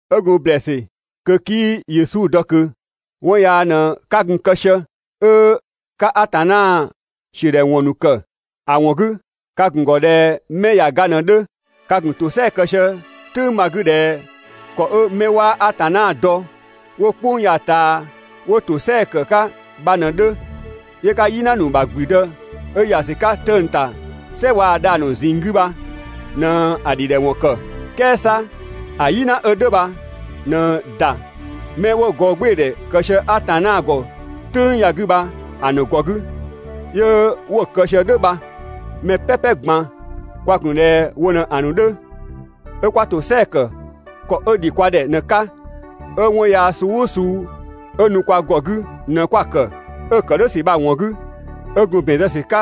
'Ö gun ‑blɛɛsü kö 'kii Yesu dɔ ꞊kö, 'wɔn yaa ꞊në 'ka gun‑ kë sië, 'ö ka Atanna ‑siödhɛwɔn ‑nu ‑kë. ‑A ‑wɔn 'gü ka ‑gun ‑gɔ ꞊dhɛ 'mɛ ꞊ya ga ꞊në‑ 'dhö. Ka ‑gun ‑tosɛa kë sië‑ "tʋ̈ng bha‑ 'gü ꞊dhɛ ‑kɔ 'ö 'mɛ 'waa Atanna dɔ 'wo "kpʋng ya‑ ꞊taa 'wo ‑tosɛa ‑kë 'ka bha ꞊në‑ 'dhö, 'yö 'ka "yina ‑nu ‑bha ‑gblüdë 'ö ‑ya ‑sü 'ka 'tëng‑ ‑ta "sɛ waa‑ dhang‑ ‑a ‑nu ꞊zinng 'gü bha ꞊në‑ ‑dhidhɛwɔn ‑kë. "Kɛɛ 'sa ‑a "yina 'ö "dhʋ̈ bha ꞊në ‑da 'mɛ 'wo gɔɔgbɩɩdhɛ kë sië Atanna ‑gɔ "tʋ̈ng ya‑ 'gü bha‑ ‑nu ‑gɔ 'gü 'yö 'wo‑ kë sië "dhʋ̈ bha. Mɛ "pɛpɛ ꞊gban kwa gun ꞊dhɛ wo ꞊në‑ ‑nu 'dhö, 'ö 'kwa ‑tosɛa ‑kë ‑kɔ 'ö ‑dhi kwa ‑dhɛ ꞊në‑ 'ka, 'ö 'wɔn yaa suu "ʋʋ suu 'ö nu kwa ‑gɔ 'gü ꞊në 'kwa‑ ‑kë, 'ö‑ ‑kë "dhʋ̈ ‑sü bha‑ ‑wɔn 'gü, 'ö gun ‑bɛn zë ‑sü 'ka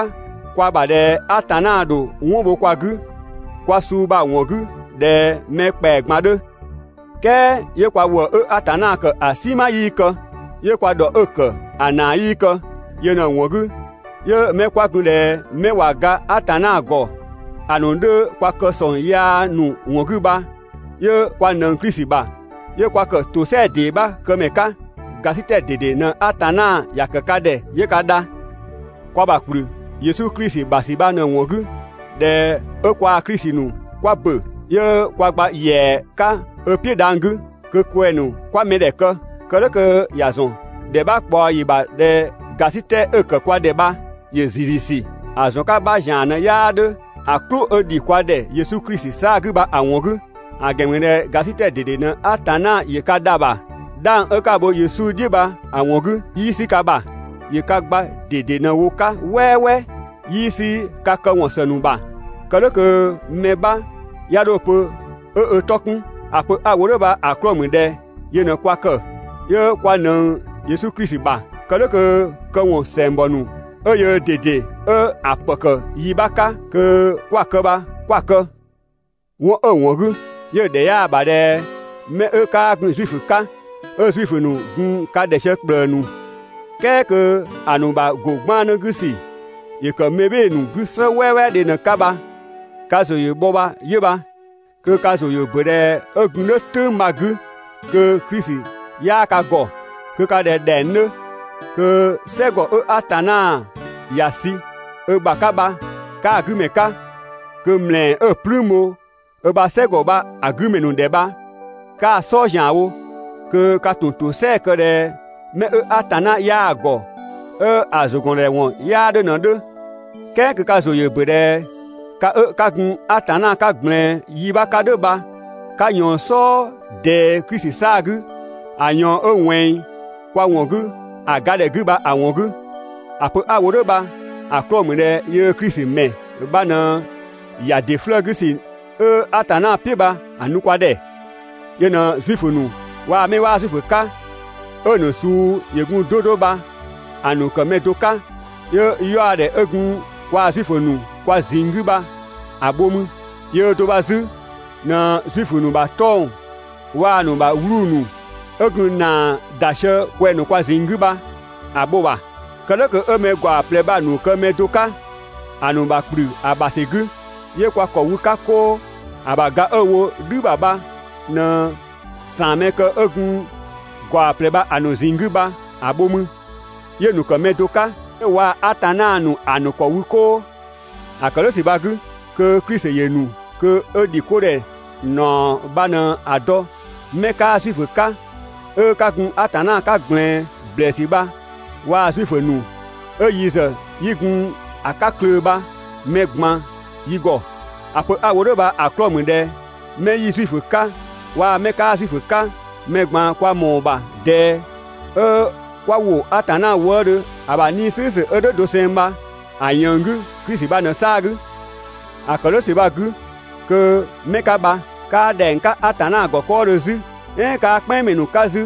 kwa ‑bha ꞊dhɛ Atanna ‑dho 'wɔn bho kwa 'gü kwa suu bha‑ ‑wɔn 'gü ꞊dhɛ mɛ ‑kpɛa ꞊gban 'dhö. "Kɛɛ 'yö kwa ‑wëë 'ö Atanna ‑kë ‑a "sinma 'yii kë, 'yö kwa ‑dhɔ 'ö‑ ‑kë ‑a ‑naa 'yii kë. Yö ꞊në‑ ‑wɔn 'gü, 'yö 'mɛ 'kwa gun ꞊dhɛ 'mɛ ꞊wa ga Atanna ‑gɔ ‑a ‑nu 'dhö kwa kë ‑sɔng yaa ‑nu ‑wɔn 'gü bha, 'yö kwa ꞊nëng Klisi ‑bha, 'yö kwa ‑kë ‑tosɛa ‑dee 'bha këmɛ 'ka. ‑Gasitɛ ꞊dede ꞊në Atanna ‑ya ‑kë ka ‑dhɛ 'yö ka dha. Kwa ‑bha ‑kplü Yesu Klisi ‑bha ‑sü bha‑ ‑wɔn 'gü ꞊dhɛ 'ö kwaa Klisi ‑nu kwa ‑bö, 'yö kwa gba ‑yɛa 'ka ö "piʋ̈ dhang‑ 'gü kö kwɛng‑ ‑nu 'kwa mɛdhɛ ‑kë. Kë "dhʋ̈ kö ‑ya ‑zɔn ‑dhɛ 'bha ꞊kpaɔ ‑yi ‑bha ꞊dhɛ ‑gasitɛ 'ö‑ ‑kë kwa ‑dhɛ bha ‑yö ‑ziiziisü, ‑a ‑zɔn 'ka 'bha ‑zian ꞊në 'yaa 'dhö ‑a "klʋ 'ö‑ ‑dhi kwa ‑dhɛ Yesu Klisi 'saa‑ 'gü bha‑ ‑wɔn 'gü. ‑A ‑gɛn ‑mü ꞊dhɛ ‑gasitɛ ꞊dede ꞊në Atanna ‑yö ka dha‑ ‑bha, 'dhang 'ö 'ka‑ bho Yesu "dhiʋ̈ bha‑ ‑wɔn 'gü, 'yii 'sü ka ‑bha, ‑yö ka gba ꞊dede ꞊në‑ wo‑ 'ka "wɛɛwɛɛ. 'Yii 'sü ka këwɔn ‑së ‑nu ‑bha, kë "dhʋ̈ kö mɛ 'bha 'ya 'dho‑ pö 'ö ö 'tɔ 'kun. ‑A pö 'a‑ wo "dhʋ̈ bha‑ 'klɔɔ‑ ‑mü ꞊dhɛ yö ꞊në kwa ‑kë, 'yö kwa ꞊nëng Yesu Klisi ‑bha. Kë "dhʋ̈ kö këwɔn ‑sɛngbɔ ‑nu 'ö yöö ꞊dede 'ö‑ ‑pë ‑kë ‑yi 'bha 'ka kö 'kwa‑ kë bha 'kwa‑ kë. 'Wɔn 'ö‑ ‑wɔn 'gü, 'yö‑ ‑dhɛ 'yaa‑ ‑bha ꞊dhɛ 'mɛ 'ö 'kaa gun Zuifö 'ka, 'ö Zuifö ‑nu gun ka ‑dhɛ sië ‑kplëë ‑nu, "kɛɛ kö ‑a ‑nu ‑bha ‑go 'gbannë 'gü ‑sü ‑yö ‑kë mɛbhɩɩdhe ‑nu 'gü "slë "wɛɛwɛɛdhe ꞊në‑ 'ka bha ka ‑zʋ ‑yö bhɔ bha 'yö bha. Kö ka ‑zʋ ‑yö ‑bö ꞊dhɛ 'ö gun "dhʋ̈ "tʋ̈ng bha‑ 'gü kö Klisi 'yaa ka ‑gɔ, kö ka ꞊dhɛ ‑dhɛng 'dhö, kö "sɛgɔ 'ö Atanna ‑ya sü ö ‑bha 'ka bha 'kaa‑ 'gü ‑mɛ 'ka, kö ‑mlɛɛ 'ö‑ "plüün bho ö ‑bha "sɛgɔ bha‑ 'gü ‑mɛ ‑nu ‑dhɛ bha, 'kaa‑ "sɔɔ ‑zianwo, kö ka ‑tun ‑tosɛa kë ꞊dhɛ 'mɛ 'ö Atanna 'yaa‑ ‑gɔ, 'ö‑ ‑zʋgɔndhɛwɔn 'yaa 'dhö ꞊në‑ 'dhö. "Kɛɛ kö ka ‑zʋ ‑yö ‑bö ꞊dhɛ ka 'ö 'ka gun Atanna 'ka ꞊gblɛɛn yi 'bha 'ka "dhʋ̈ bha 'ka ꞊yɔɔn‑ "sɔɔ ꞊dɛɛ Klisi 'saa‑ 'gü ‑a ꞊yɔɔn 'ö ꞊wɛnng kwa ‑wɔn 'gü ‑a ga ‑dhɛ 'gü bha‑ ‑wɔn 'gü. ‑A pö 'a‑ wo "dhʋ̈ bha‑ 'klɔɔ‑ ‑mü ꞊dhɛ yöö Klisi ‑mɛ bha ꞊në ‑ya ‑dɩ 'flëë‑ 'gü ‑sü 'ö Atanna "piʋ̈ bha‑ nu kwa ‑dhɛ, yö ꞊në Zuifö ‑nu waa‑ 'mɛ 'waa Zuifö 'ka 'ö‑ ‑nu suu ‑yö gun 'do 'do bha‑ ‑nu ‑kë mɛ do 'ka, 'yö 'yaɔdhɛ 'ö gun kwaa Zuifö ‑nu kwa ꞊zinng 'gü bha‑ bho mü. Yöö do bha 'zü ꞊në Zuifö ‑nu ‑bha 'tɔng‑ waa‑ ‑nu ‑bha 'wluu‑ ‑nu 'ö gun ‑naa ‑da sië kwɛng‑ ‑nu kwa ꞊zinng 'gü bha‑ bho‑ ‑bha. Kë "dhʋ̈ kö 'ö mɛ ‑gaɔ ꞊plɛ bha‑ ‑nu kë mɛ do 'ka ‑a ‑nu ‑bha ‑kplü ö ‑bha ‑sü 'gü, 'yö kwa ‑kɔ wü‑ 'ka 'koo. ‑A ‑bha ga 'ö‑ wo "dhü ‑bha bha ꞊në ‑saanmɛkë 'ö gun ‑gaɔ ꞊plɛ bha‑ ‑nu ꞊zinng 'gü bha‑ bho mü, 'yö‑ ‑nu ‑kë mɛ do 'ka, 'yö waa‑ Atanna ‑nu ‑a ‑nu ‑kɔ wü 'koo. ‑A ‑kë "dhʋ̈ ‑sü bha‑ 'gü, kö Klisi ‑yö ‑nu kö 'ö ‑dhikodhɛ ‑naɔ bha ꞊në‑ dɔ 'mɛ 'kaa Zuifö 'ka 'ö 'ka gun Atanna 'ka ꞊gblɛɛn ‑blɛɛsü bha waa‑ Zuifö ‑nu 'ö yi ‑zë 'yi gun‑ 'ka klöö‑ bha mɛ ꞊gban yi ‑gɔ. ‑A pö 'a‑ wo "dhʋ̈ bha‑ 'klɔɔ‑ ‑mü ꞊dhɛ 'mɛ 'yi Zuifö 'ka waa‑ 'mɛ 'kaa Zuifö 'ka, mɛ ꞊gban kwa ‑mɔɔ ‑bha ꞊dɛɛ 'ö 'kwa ‑wo Atanna wëëdhö ‑a ‑bha 'Nii‑ "slʋ̈ʋ̈slʋ̈ 'ö "dhʋ̈ doseng bha‑ ꞊yënng 'gü Klisi bha ꞊në‑ 'saa‑ 'gü. ‑A ‑kë "dhʋ̈ ‑sü bha‑ 'gü kö 'mɛ 'ka bha, 'kaa ‑dhɛng 'ka Atanna ‑gɔ 'kɔɔdhö 'zü, "ɛɛn 'kaa "kpɛnngmɛ ‑nu 'ka 'zü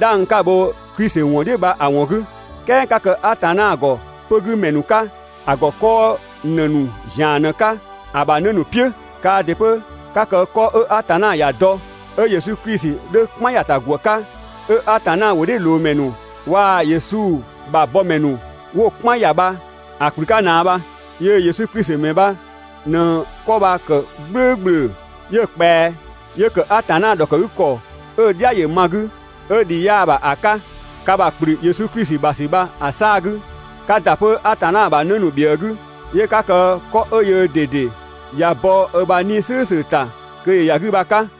'dhang 'ka‑ bho Klisi ‑wɔn "dhiʋ̈ bha‑ ‑wɔn 'gü, "kɛɛ 'ka kë Atanna ‑gɔ 'pö‑ 'gü ‑mɛ ‑nu ꞊në‑ 'ka, ‑a ‑gɔ 'kɔɔ ‑në ‑nu ‑zian ꞊në‑ 'ka, ‑a ‑bha 'në ‑nu "piʋ̈. Kaa ‑dɩ 'pö 'ka kë 'kɔ 'ö Atanna ‑ya dɔ, 'ö Yesu Klisi 'dhö‑ "kpan ‑ya ‑ta ‑gwë 'ka, 'ö Atanna ‑wʋdhiʋ̈loomɛ ‑nu waa‑ Yesu ‑bha bɔmɛ ‑nu 'wo‑ "kpan ‑ya bha‑ ‑kplü 'ka ꞊naa bha. Yöö Yesu Klisi ‑mɛ bha ꞊në 'kɔ bha‑ ‑kë "gblʋ̈ʋ̈gblʋ̈, 'yö ꞊kpɛa 'yö ‑kë Atanna ‑dhɔkëgükɔ 'ö‑ "dhia ‑yö ma‑ 'gü, 'ö ‑dhii 'yaa‑ ‑bha ‑a 'ka. Ka ‑bha ‑kplü Yesu Klisi ‑bha ‑sü bha‑ 'saa‑ 'gü, 'ka ‑da 'pö Atanna ‑bha 'në ‑nu ‑bhiëë 'gü, 'yö 'ka kë 'kɔ 'ö yöö ꞊dede ꞊ya bɔ ö ‑bha 'Nii‑ "slʋ̈ʋ̈slʋ̈ ‑ta kö ‑yö ‑ya 'gü bha‑ 'ka.